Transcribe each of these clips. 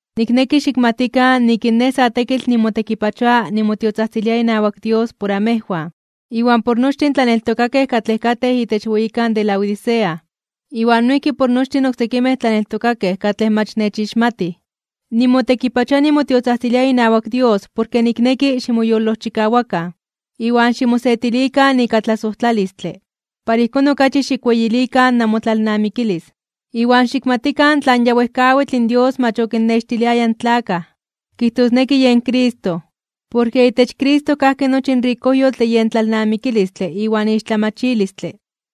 Nikneki xikmatikan nik in nej sa tekitl nimotekipachoa nimotiotzajtzilia inawak Dios por amejwan, iwan por nochtin in tlaneltokakej katlej katej itech weyikan Laodicea, iwan noijki por nochtin oksekimej tlaneltokakej katlej mach nechixmatij. Nimotekipachoa nimotiotzajtzilia inawak Dios porke nikneki ximoyolojchikawakan, iwan ximosetilikan ika tlasojtlalistle, para ijkón okachi xikweyilikan namotlalnamikilis, iwan xikmatikan tlan ya wejkawitl in Dios mach okinnextiliaya in tlakaj, kijtosneki yen Cristo. Porke itech Cristo kajki nochi in rikojyotl de yen tlalnamikilistle iwan ixtlamachilistle.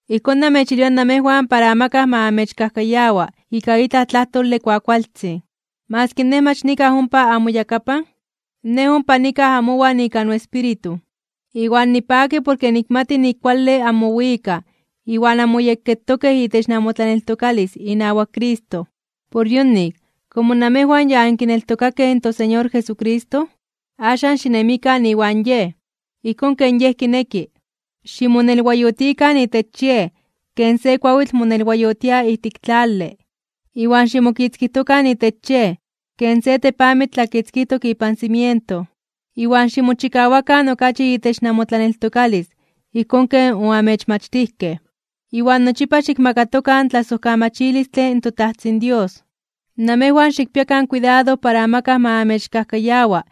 Ijkón namechilwia namejwan para amakaj ma amechkajkayawa ika itlaj tlajtole kuakualtzin. Maski nej mach nikaj ompa amoyakapan, nej ompa nikaj amowan ika noespíritu, iwan nipaki porke nikmati nik kuale anmowikaj iwan anmoyekketokej itech namotlaneltokalis inawak Cristo. Por yonik, komo namejwan ya ankineltokakej in toSeñor Jesucristo, axan xinemikan iwan Yej, ijkón ken Yej kineki. Ximonelwayotikan itech Yej ken se kuawitl monelwayotia ijtik tlale. Iwan ximokitzkijtokan itech Yej ken se tepamitl tlakitzkijtok ipan cimiento. Iwan ximochikawakan okachi itech namotlaneltokalis ijkón ken oamechmachtijkej. Iwan nochipa xikmakatokan tlasojkamachilistle in toTajtzin Dios. Namejwan xikpiakan kuidado para amakaj ma amechkajkayawa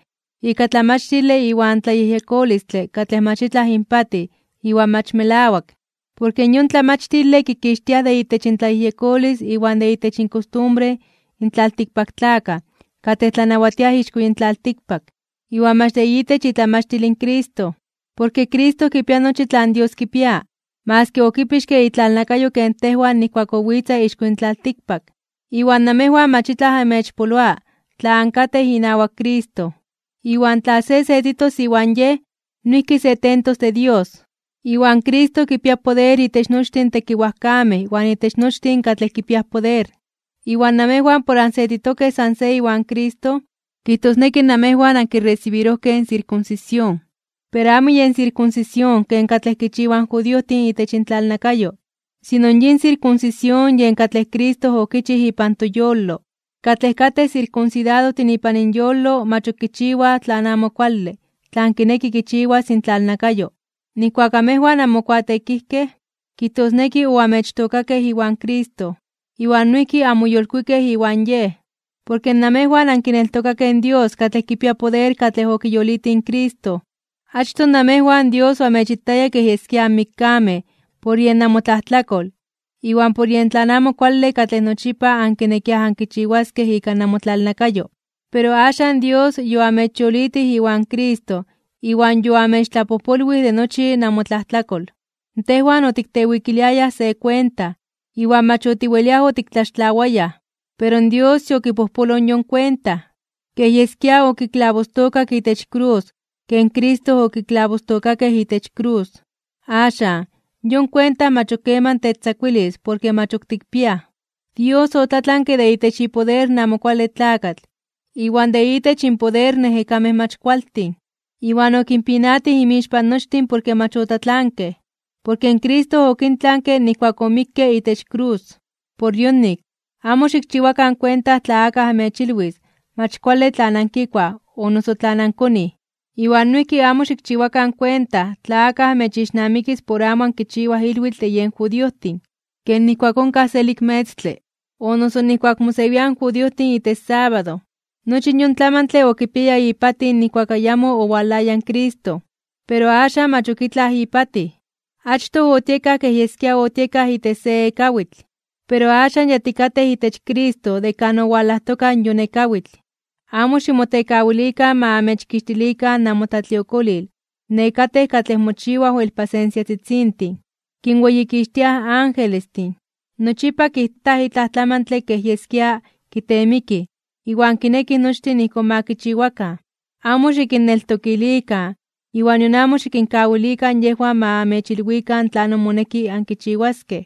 ika tlamachtile iwan tlayejyekolistle katlej mach itlaj inpatij iwan mach melawak. Porke yon tlamachtile kikixtiaj de itech intlayejyekolis iwan de itech inkostumbre in tlaltikpaktlakaj katlej tlanawatiaj ixko yin tlaltikpak, iwan mach de itech itlamachtil in Cristo. Porke Cristo kipia nochi tlan Dios kipia, maski okipixke itlalnakayo ken tejwan nijkuak owitza ixko yin tlaltikpak. Iwan namejwan mach itlaj amechpoloa tla ankatej inawak Cristo, iwan tla se setitos iwan Yej, noijki se tentos de Dios. Iwan Cristo kipia poder itech nochtin tekiwajkamej iwan itech nochtin katlej kipia poder. Iwan namejwan por ansetitokej san se iwan Cristo, kijtosneki namejwan ankiresibirojkej in sirkunsisión. Pero amo yen sirkunsisión ken katlej kichiwaj in judiojtin itech intlalnakayo, sino yin sirkunsisión yen katlej Cristo okichij ipan toyolo. Katlej katej sirkunsidadojtin ipan inyolo mach ok kichiwaj tlan amo kuale tlan kineki kichiwas intlalnakayo. Nijkuak amejwan anmokuateekijkej, kijtosneki oamechtookakej iwan Cristo, iwan noijki anmoyolkuikej iwan Yej. Porke namejwan ankineltokakej in Dios katlej kipia poder katlej okiyolitij in Cristo. Achtoj namejwan Dios amechitaya kej yeskia anmikkamej por yen namotlajtlakol iwan por yen tlan amo kuale katlej nochipa ankinekiaj ankichiwaskej ika namotlalnakayo. Pero axan Dios yoamechyolitij iwan Cristo iwan yoamechtlapojpolwij de nochi namotlajtlakol. Tejwan otiktewikiliayaj se kuenta, iwan mach otiweliaj otiktlaxtlawayaj. Pero Dios yokipojpoloj yon kuenta. Kej yeskia okiklabostookak itech krus ijkón ken Cristo okiklabostookakej itech krus. Axan, yon kuenta mach ok keman techtzakuilis porke mach ok tikpiaj. Dios otlatlanke de itech ipoder in Amo Kuale Tlakatl iwan de itech inpoder in ejekamej mach kualtin. Iwan okinpinatij inmixpan nochtin porke mach otlatlankej, porke Cristo okintlanke nijkuak omikke itech krus. Por yonik, amo xikchiwakan kuenta tla akaj amechilwis mach kuale tlan ankikuaj o noso tlan ankonij. Iwan noijki amo xikchiwakan kuenta tla akaj amechixnamikis por amo ankichiwaj ilwitl de yen judiojtin, ken nijkuak onkaj selik metztle, o noso nijkuak mosewiaj in judiojtin itech sábado. Nochi yon tlamantle okipiaya ipatij nijkuak ayamo owalaya in Cristo, pero axan mach ok itlaj ipatij. Achtoj otiekaj kej yeskia otiekaj itech se ekawitl, pero axan ya tikatej itech Cristo de kan owalajtoka in yon ekawitl. Amo ximotekawilikan ma amechkixtilikan namotlatliokolil nekatej katlej mochiwaj wel pasensiatzitzintin, kinweyikixtiaj angelestin, nochipa kijtaj kitaj itlaj tlamantle kej yeskia kiteemikij iwan kinekij nochtin ijkón ma kichiwakan. Amo xikinneltokilikan iwan nion amo xikinkawilikan yejwan ma amechilwikan tlanon moneki ankichiwaskej.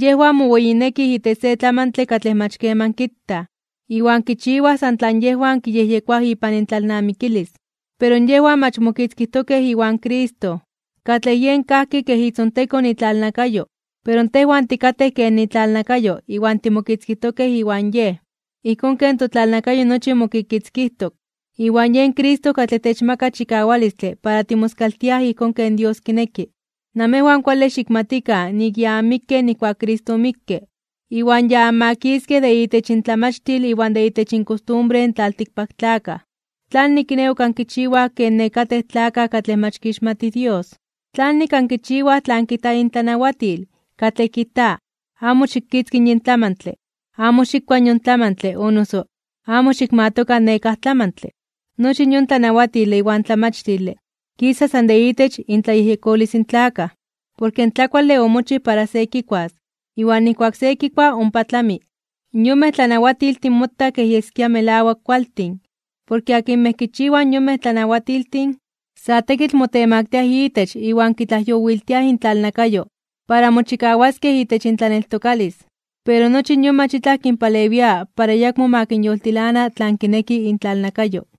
Yejwan moweyinekij itech se tlamantle katlej mach keman kitaj, iwan kichiwaj san tlan yejwan kiyejyekoaj ipan intlalnamikilis. Pero yejwan mach mokitzkijtokej iwan Cristo, katlej yen kajki kej itzontekon itlalnakayo. Pero tejwan tikatej ken itlalnakayo iwan timokitzkijtokej iwan Yej, ijkón ken totlalnakayo nochi mokikitzkijtok. Iwan yen Cristo katlej techmaka chikawalistle para timoskaltiaj ijkón ken Dios kineki. Namejwan kuale xikmatikan nik ya anmikkej nijkuak Cristo omikke, iwan ya anmakiskej de itech intlamachtil iwan de itech inkostumbre in tlaltikpaktlakaj. ¿Tlanik kiné ok ankichiwaj ken nekatej tlakaj katlej mach kixmatij Dios? ¿Tlanik ankichiwaj tlan kijta intlanawatil, katlej kijta: “amo xikitzki yin tlamantle, amo xikua yon tlamantle, amo xikmatoka nekáj tlamantle”? Nochi yon tlanawatile iwan tlamachtile kisa san de itech intlayejyekolis in tlakaj, porke in tlakuale omochij para se kikuas, iwan nijkuak se kikua ompa tlami. Yonmej tlanawatiltin motaj kej yeskia melawak kualtin, porke akinmej kichiwaj yonmej tlanawatiltin, sa tekitl motemaktiaj itech iwan kitlajyowiltiaj intlalnakayo para mochikawaskej itech intlaneltokalis. Pero nochi yon mach itlaj kinpalewia para ayakmo ma kinyoltilana tlan kineki intlalnakayo.